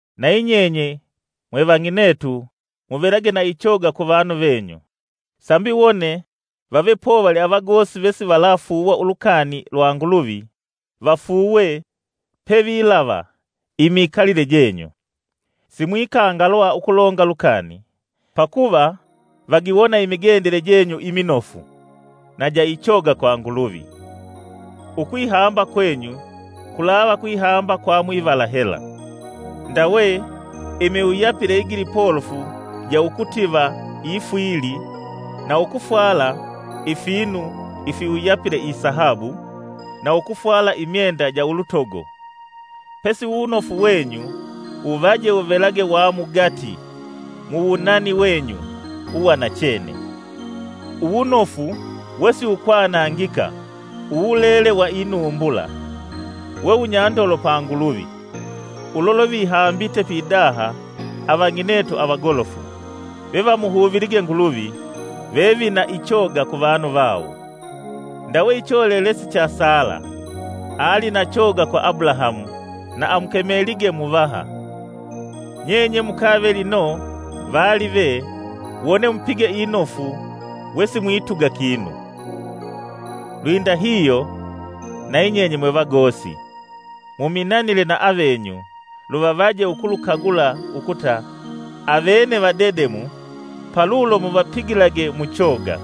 Nayi nyenye mwe vang'inetu muvelage na ichoga ku vanu venyu, sambi wone vave povali avagosi vesivalafuuwa ulukani lwa Nguluvi vafuuwe pevilave imikalile jenyu. Simwikangalwa ukulonga lukani, pakuva vagiwona imigendele jenyu iminofu na ja ichoga kwa Nguluvi. Ukwihamba kwenyu kulava kwihamba kwa mwivala hela, ndawe imiwuyapile igilipolofu ja ukutiva ifwili na ukufwala ifinu ifiwuyapile isahabu, na ukufwala imyenda ja ulutogo. Pesi wuwunofu wenyu wuvaje wuvelage wa mugati muwunani wenyu uwanachene, uwunofu wesiwukwanangika uwulele wa inumbula, we wunyandolo pa Nguluvi. Ulo lwevihambite pidaha avang'inetu avagolofu, vevamuhuvilige Nguluvi, vevina ichoga ku vanu vawo. Ndawe icholelesi cha Sala, ali na choga kwa Abulahamu na amukemelige muvaha. Nyenye mukave lino vaalive wone mupige inofu wesimwituga kinu. Lwindahihyo nayi nyenye mwevagosi, muminanile na avavenyu luvavaje ukulukagula ukuta avene vadedemu palulo muvapigilage muchoga;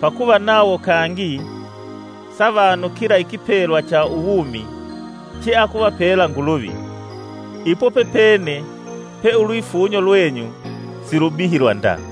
pakuva nawo kangi savanukila ikipelwa cha uwumi cheakuvapela Nguluvi. Ipo pepene pe ulwifunyo lwenyu silubihilwa nda.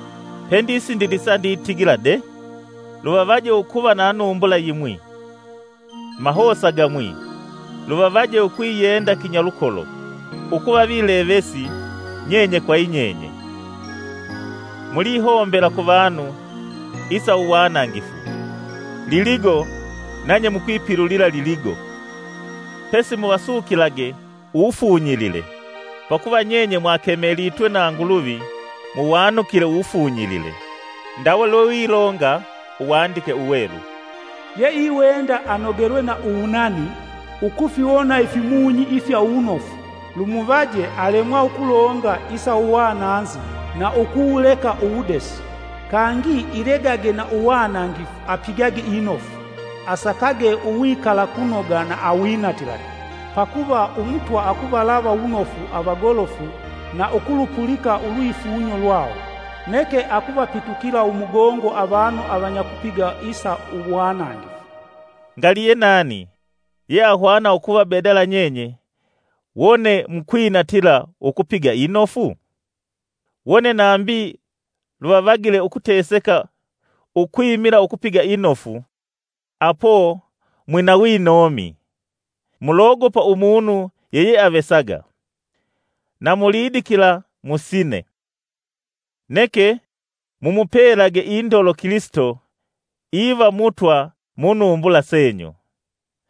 Pendisindilisa nditigila de: luvavaje ukuva na numbula yimwi, mahosa gamwi, luvavaje ukwiyenda kinyalukolo, ukuva vilevesi nyenye kwa yinyenye. Mulihombela ku vanu isa uwanangifu, liligo nanye mukwipilulila liligo; pesi muvasukilage uwufunyilile, pakuva nyenye mwakemelitwe na Nguluvi mwanukile uwufunyilile. Ndawe lwewilonga Uwandike Uwelu; “Yeiwenda anogelwe na uwunani, ukufiwona ifimunyi ifya uwunofu. lumuvaje alemwa ukulonga isa uwananzi na ukuwuleka uwudesi. Kangi ilegage na uwanangifu, apigage inofu, asakage uwikalakunoga na awinatilage. Pakuva Umutwa akuvalava wunofu avagolofu na ukulupulika ulwifunyo lwawo. Neke akuvapitukila umugongo avanu avanyakupiga isa uwanangifu.” Ngali yenani yeahwana ukuvabedala nyenye wone mukwinatila ukupiga inofu? Wone nambi luvavagile ukuteseka ukwimila ukupiga inofu, apo mwina winomi. Mulogopa umunu yeyeavesaga, na mulidikila musine. Neke mumupelage indolo Kilisito iva Mutwa munumbula senyu.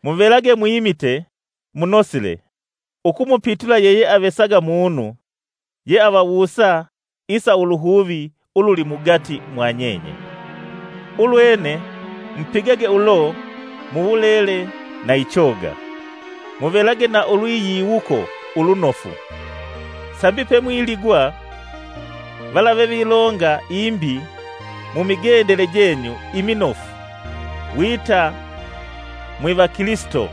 Muvelage mwimite munosile ukumupitula yeyeavesaga munu yeavawusa isa uluhuvi ululi mugati mwanyenye, ulwene mupigage ulo muwulele na ichoga. Muvelage na ulwiyiwuko ulunofu, sambi pemwiligwa, vala vevilonga imbi mumigendele jenyu iminofu wita mwivakilisito,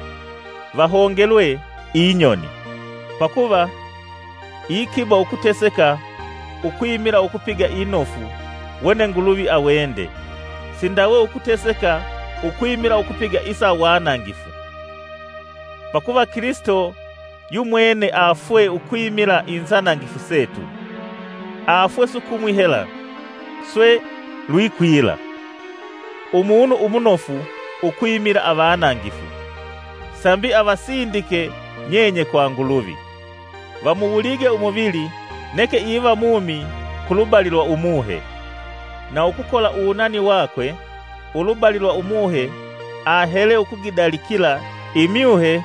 vahongelwe inyoni. Pakuva iikiba ukuteseka ukwimila ukupiga inofu wone Nguluvi awende, sindawe ukuteseka ukwimila ukupiga isa uwanangifu. Pakuva Kilisito yumwene afwee ukwimila inzanangifu setu; afwee sukumwi hela swe lwikwila, umunu umunofu ukwimila avanangifu, sambi avasindike nyenye kwa Nguluvi, vamuwulige umuvili neke iva mumi ku lubali lwa umuhe; na ukukola uwunani wakwe ulubali lwa Umuhe ahele ukugidalikila imyuhe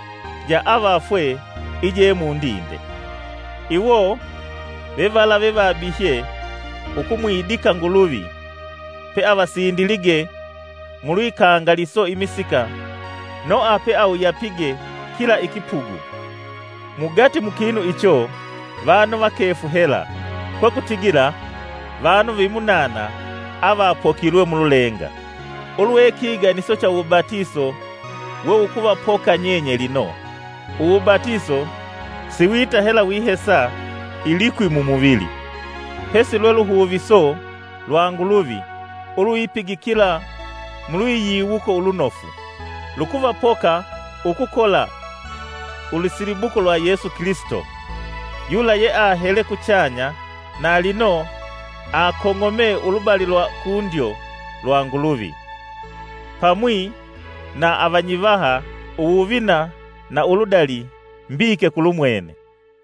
ja avafwee je mundinde. Iwo vevala vevabihye ukumwidika Nguluvi peavasindilige mulwikangaliso imisika Noha peawuyapige kila ikipugu. Mugati mu kinu icho vanu vakefu hela, kwekutigila vanu vimunana avapokilwe mululenga, ulwe kiganiso cha uwubatiso wewukuvapoka nyenye lino. Uwubatiso siwita hela wihesa ilikwi mumuvili, pesi lwe luhuviso lwa Nguluvi ulwipigikila mulwiyiwuko ulunofu. Lukuvapoka ukukola ulusilibuko lwa Yesu Kilisito, yula yeahele kuchanya na lino akong'ome ulubali lwa kundyo lwa Nguluvi, pamwi na avanyivaha imbali mbesili mbike kulumwene.